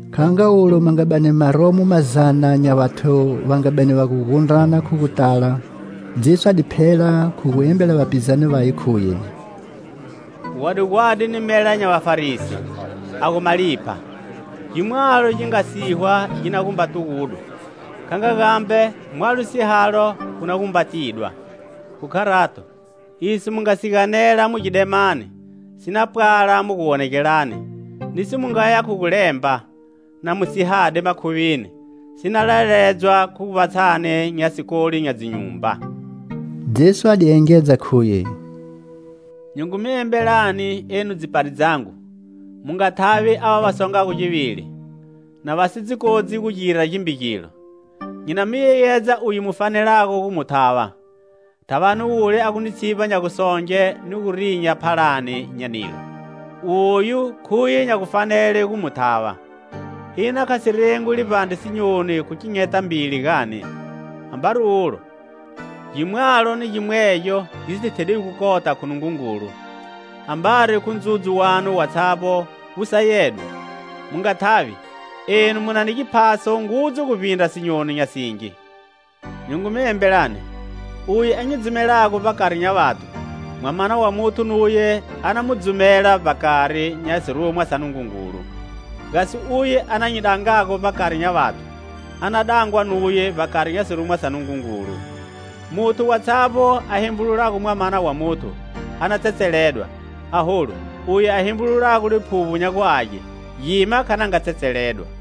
Kha nga ulo ma nga bani ma romo mazana nya vathu va nga bani va gu gundrana khu gu tala, Jesu a di phela khu gu embela vapizane vaye, khuye: "Gwadi gwadi ni mela nya Vafarisi, a gu malipha. Gi mwalo gi nga sihwa gi na gumba tugudwa; kha nga gambe, mwalo sihalo wu na gu mba tidwa. Khu kharato, iso mu nga si ganela mu gidemani si na pwala mu guwonegelani; niso mu ngaya khu gu lemba, na mu sihade makhuvini, si na laledzwa khu vbatshani nya sikoli nya dzinyumba." Jesu a di engedza khuye: "Nyi ngu mi embelani, enu dzipari dzangu: mu nga thavi ava va songago givili, na va si dzi kodzi gu gira gimbe gilo. Nyi na mi yeyedza uye mu fanelago gu mu thava: thavani wule a gu ni tshivba nya gusonge ni gu rinya phalani nya nilo. Oyu khuye nya gufanele gu mu thava. Ina kha si rengwi livbandre sinyoni khu kinyeta mbili, gani? Ambari ulo, gimwalo ni gimwegyo gi si thedwigo kota khu Nungungulu. Ambari khu ndzudzu wanu watshavbo wu sayedwe. Mu nga thavi; enu mu na mi giphaso ngudzu guvbindra sinyoni nya singi. "Nyi ngu mi embelani: uye a nyi dzumelago vbakari nya vathu, Mwamana wa Muthu nuwe a na mu dzumela vbakari nya sirumwa sa Nungungulu. Gasi uye a na nyi dangago vbakari nya vathu, a na dangwa nuye vbakari nya sirumwa sa Nungungulu. Muthu watshavbo a hembululago Mwamana wa Muthu, a na tsetseledwa; aholu, uye a hembululago Liphuvbo nya gu Age, gima kha na nga tsetseledwa.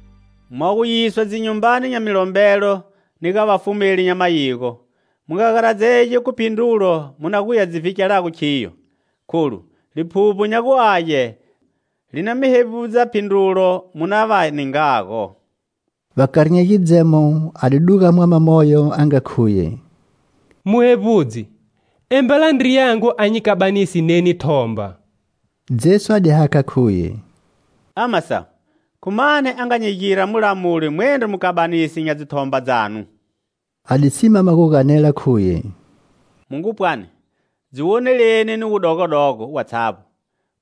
Mwa gu yiswa dzinyumbani nya milombelo ni ga vafumeli, nya mayigo, mu nga garadzegi khu phindrulo mu na guya dzi vhikelago khiyo, kholu Liphuvbo nya gu Age li na mi hevbudza phindrulo mu na va ningago." Vbakari nya gidzemo a di duga mwama moyo a nga khuye: "Muhevbudzi, embela ndriyangu a nyi kabanise neni thomba." Jesu a di hakha khuye: "Ama sawu, khu mani a nga nyi gira mulamuli mwendro mukabanisi nya dzithomba dzanu?" A di simama gu ganela, khuye: "Mu ngu pwani, dziwoneleni ni wudogodogo watshavbo,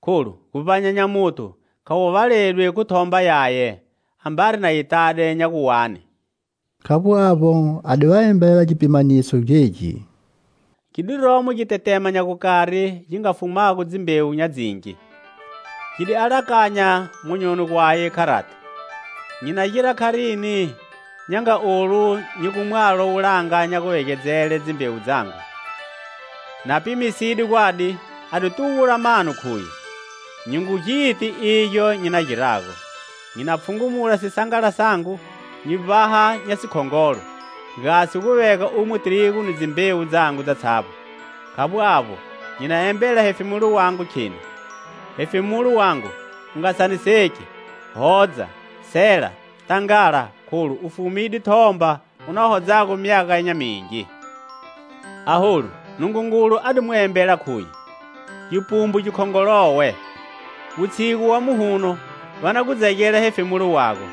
kholu guvbanya nya muthu kha gu valedwi khu thomba yaye, ambari na yi tade nya gu wani." Khavbo avbo, a di va embele gipimaniso gegi: "Gi di romo gitetema nya gukari gi nga fumago dzimbewu nya dzingi. Gi di alakanya monyoni gwaye kharati: 'Nyi na gira kharini nya nga olu nyi gu mwalo wulanga nya guvegedzele dzimbewu dzangu?' Na pimisede gwadi a di tugula mano khuye: 'Nyi ngu giti igyo nyi na girago. Nyi na pfhungumula sisangala sangu, nyi vbaha nya sikhongolo, gasi gu vega umo tirigu ni dzimbewu dzangu dzatshavbo. Khavbo avbo, nyi na embela hefemulo wangu, kheni: Hefemulo wangu, u nga saniseki; hodza, sela, tangala, kholu u fumide thomba u na hodzago myaga nya mingi.' Aholu Nungungulu a di mu embela, khuye: 'Gipumbu gikhongolowe! Wutshigu wa muhuno va na gu dzegela hefemulo wago.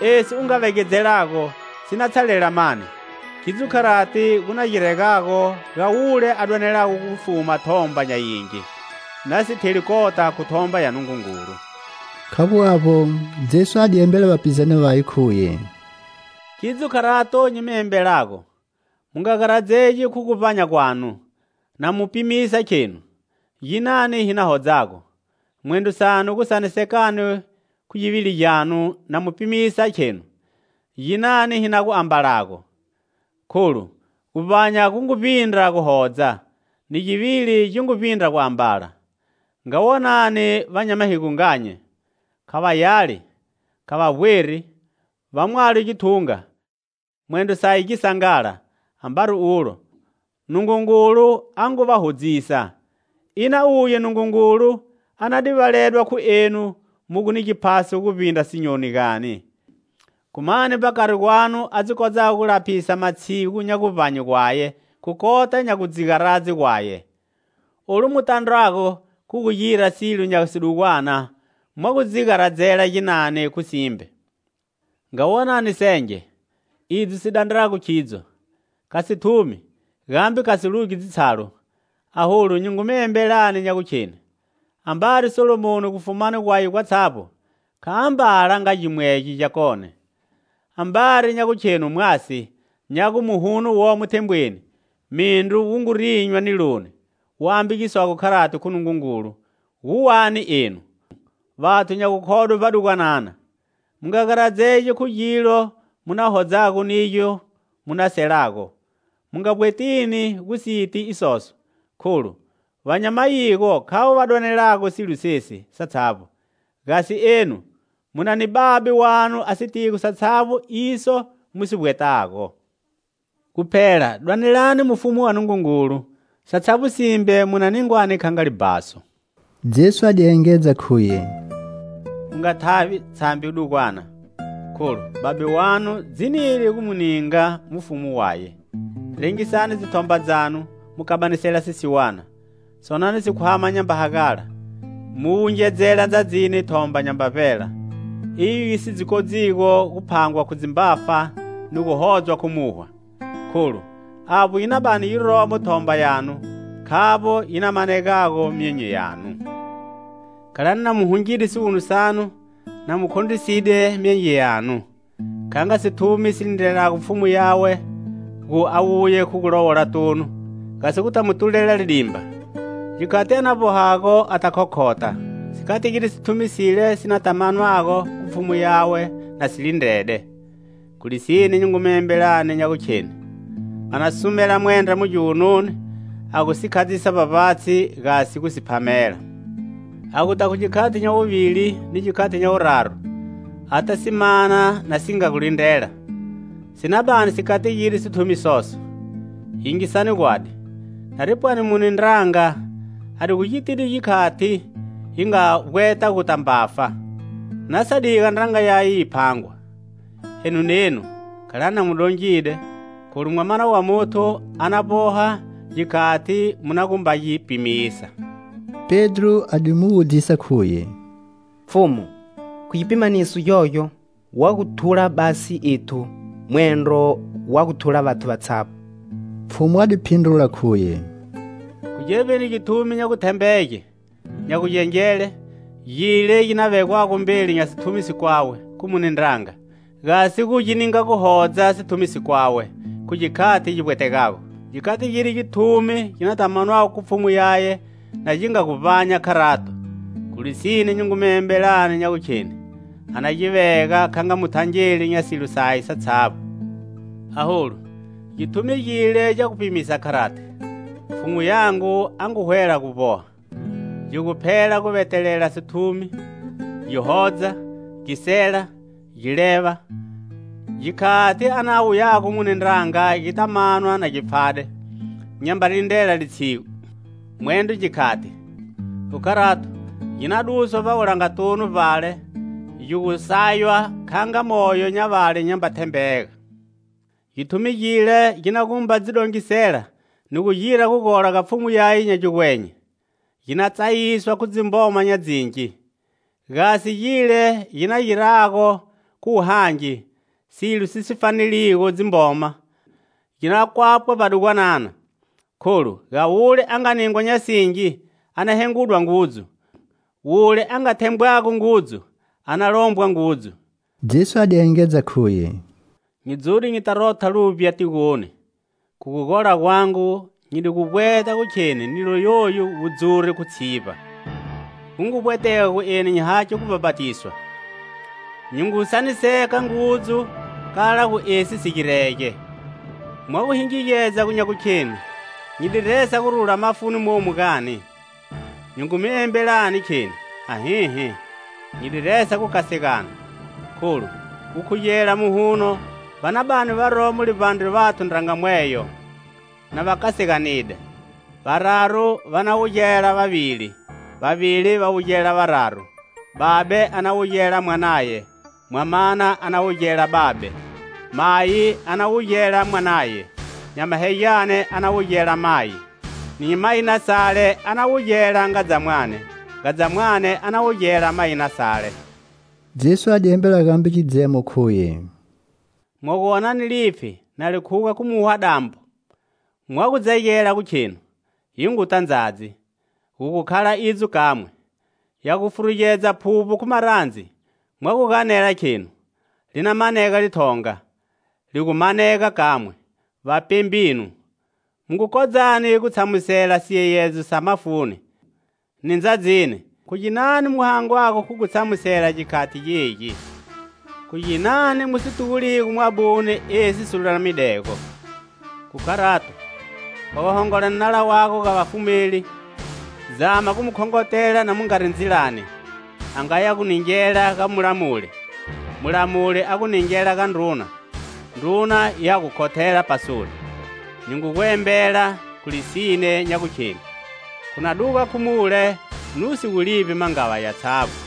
Esi u nga vegedzelago si na tshalela mani?' Khidzo kharati gu na giregago ga wule a dwanelago gu fuma thomba nya yingi, na si theli kota khu thomba ya Nungungulu." Khavbo avbo Jesu a di embela vapizane vaye, khuye: "Khidzo kharato nyi mi embelago: mu nga garadzegi khu guvbanya gwanu, na mu pimisa, khenu: ginani hi na hodzago? Mwendro sanu gu sanisekani khu givili gyanu, na mu pimisa, khenu: ginani hi na gu ambalago? Kholu guvbanya gu ngu vbindra guhodza; ni givili gi ngu vbindra guambala. Nga wonani vamahigonganye. Kha va yali, kha va vbweri, va mwalo githunga, mwendro saye gisangala, ambari ulo, Nungungulu a ngu va hodzisa. Ina uye Nungungulu a na divaledwa khu enu mu gu ni giphaso guvbindra sinyoni gani? Khu mani, vbakari gwanu, a dzi kodzago gu laphisa matshigu nya guvbanye gwaye khu kota nya gu dzi garadze gwaye? Olu mu tandrwago khu gu gira silo nya sidugwana mwa gu dzi garadzela ginani khu simbe. Nga wonani senge, idzo si dandrago khidzo! Kha si thumi gambe kha si lugi dzitshalu.Aholu nyi ngu mi embelani nya gukheni: ambari Salomoni, gufumani gwaye gwatshavbo, kha ambala kha nga gimwegyo gyakone. Ambari nya gukhenu mwasi, nya gu muhuno womo thembweni, mindru wu gu rinywa niloni, wu ambagiswago kharati khu Nungungulu, gu wani enu, vathu nya gukhodwe vbadugwanana? Mu nga garadzegi khu gilo mu na hodzago nigyo mu na selago; mu nga vbwetini gu si ti isoso. Kholu va nya mayigo khavo va dwanelago silo sesi satshavbo. Gasi enu mu na ni Babe wanu a sitigo satshavbo iso mu si vbwetago. Guphela, dwanelani mufumu wa Nungungulu satshavbo simbe mu na ningwani kha nga libhaso." Jesu a di engedza khuye: "Mu nga thavi, tshambi dugwana, kholu Babe wanu dzinide gu mu ninga mufumu waye. Rengisani dzithomba dzanu, mu kabanisela sisiwana. Sonani sikhwama nyamba hagala, mu wungedzela ndzadzini thomba nyamba vbela, iyo yi si dzi kodzigo gu phangwa khu dzimbafa ni gu hodzwa khu muhwa, kholu avbo yi na bani yiromo thomba yanu, khavbo yi na manegago myonyo yanu. "Khalani na mu hungide siwunu sanu, na mu khondriside myenge yanu. Kha nga sithumi si lindrelago pfhumu yawe, gu a wuye khu gulowolatunu, gasi guta mu tulela lidimba. Gikhati a na vbohago ata khokhotha. Si kategide sithumi sile si na ta manwago khu pfhumu yawe na si lindrede. Khu lisine nyi ngu mi embelani nya gu kheni: a na sumela mwendra mu giwununi, a gu si khadzisa vbavbatshi, gasi gu si phamela. A guta khu gikhati nya wuvili ni gikhati nya wuraru, ata si mana na si nga gu lindrela, si na bani si kategide sithumi soso. Yingisani gwadi: nari pwani mune ndranga a di gitide gikhati yi nga vbweta guta mbafa, na sa diga ndranga yaye yi phangwa. Enu nenu, khalani na mu dongide, kholu Mwamana wa Muthu a na vboha gikhati mu na gumba gi pimisa." Pedro a di mu wudzisa, khuye: "Pfhumu, khu gipimaniso gyogyo wa gu thula basi ethu mwendro wa gu thula vathu vatshavbo?" Pfhumu a di phindrula, khuye: "Khu gevbini githumi nya guthembege, nya gugengele, gile gi na vegwago mbeli nya sithumi sikwawe khu mune ndranga, gasi gu ninga guhodza sithumi sikwawe khu gikhati gi vbwetegago? Gi kategide githumi gi nata manwago khu pfhumu yaye na gi nga gu vbanya kharato. Khu lisine nyi ngu mi embelani nya gukheni a na gi vega kha nga muthangeli nya silo saye satshavbo. Aholu githumi gile gya gu pimisa kharati: 'Pfhumu yangu a ngu hwela gu vboha,' gi gu phela gu vetelela sithumi, gi hodza, gi sela, gi leva, gikhati a na wuyago mune ndranga gi nata manwa na gi pfhade, nyamba lindrela litshigu, mwendro gikhati. Khu kharato, gi na duswa vbawulangatunu vbale, gi gu saywa kha nga moyo nya vale nyamba thembega. Githumi gile gi na gumba dzi dongisela ni gu gira gugola ga pfhumu yaye nya gigwenye, gi na tsayiswa khu dzimboma nya dzingi. Gasi gile gi na girago, khu wuhangi, silo si fanelago dzimboma, gi na kwapwa vbadugwanana. Kholu, ga wule a nga ningwa nya singi a na hengudwa ngudzu; wule a nga thembwago ngudzu a na lombwa ngudzu." Jesu a di engedza khuye: "Nyi dzude nyita rotha luvbya tigoni. Khu gugola gwangu nyi di gu vbweta gu kheni nilo yoyu wu dzure khu tshivba. Gu ngu vbwetega gu eni nyi hakhe gubhapatiswa. Nyi ngu saniseka ngudzu kala gu esi si girege. Mwa gu hingigedza nya gukhenu nyi di resa gurula mafuni momu, gani? Nyi ngu mi embelani, kheni: Ahihi. Nyi di resa gukasegana. Kholu, gukhugela muhuno va na bani varomo livbandre vathu ndranga mweyo na va kaseganide: Vararu va na wugela vavili, vavili va wugela vararu. Babe a na wugela mwanaye, mwamana a na wugela babe; mayi a na wugela mwanaye, nyamahegyane a na wugela mayi; ni mayinasale a na wugela ngadzamwane, ngadzamwane a na wugela mayinasale." Jesu a di embela gambe gidzemo, khuye: "Mwagu wonani lipfhi na li khuga khu muhwa-dambo, mwa gu dzegela gu khenu: 'Yi nguta ndzadzi.' Gu gu khala idzo kamwe. Ya gu furugedza phuvbo khu marandzi, mwa gu ganela khenu: 'Li na manega lithonga.' Li gu manega kamwe. Vapembinu, mu kodzago gu tshamusela siyeyedzo sa mafuni ni ndzadzini, khu ginani mu hangwago khu gu tshamusela gikhati gegi? Khu ginani mu si tuguligo mwabune, esi si lulamidego? "Khu kharato, wa gu hongola ni nala wago ga vafumeli, zama gu mu khongotela na mu ngari ndzilani, a ngaya gu ningela ga mulamuli, mulamuli a gu ningela ga ndruna, ndruna ya gu khothela pasoni. Nyi ngu gu embela, khu lisine, nya gukheni: khu na duga khu mule nu si gu livbi mangava yatshavbo."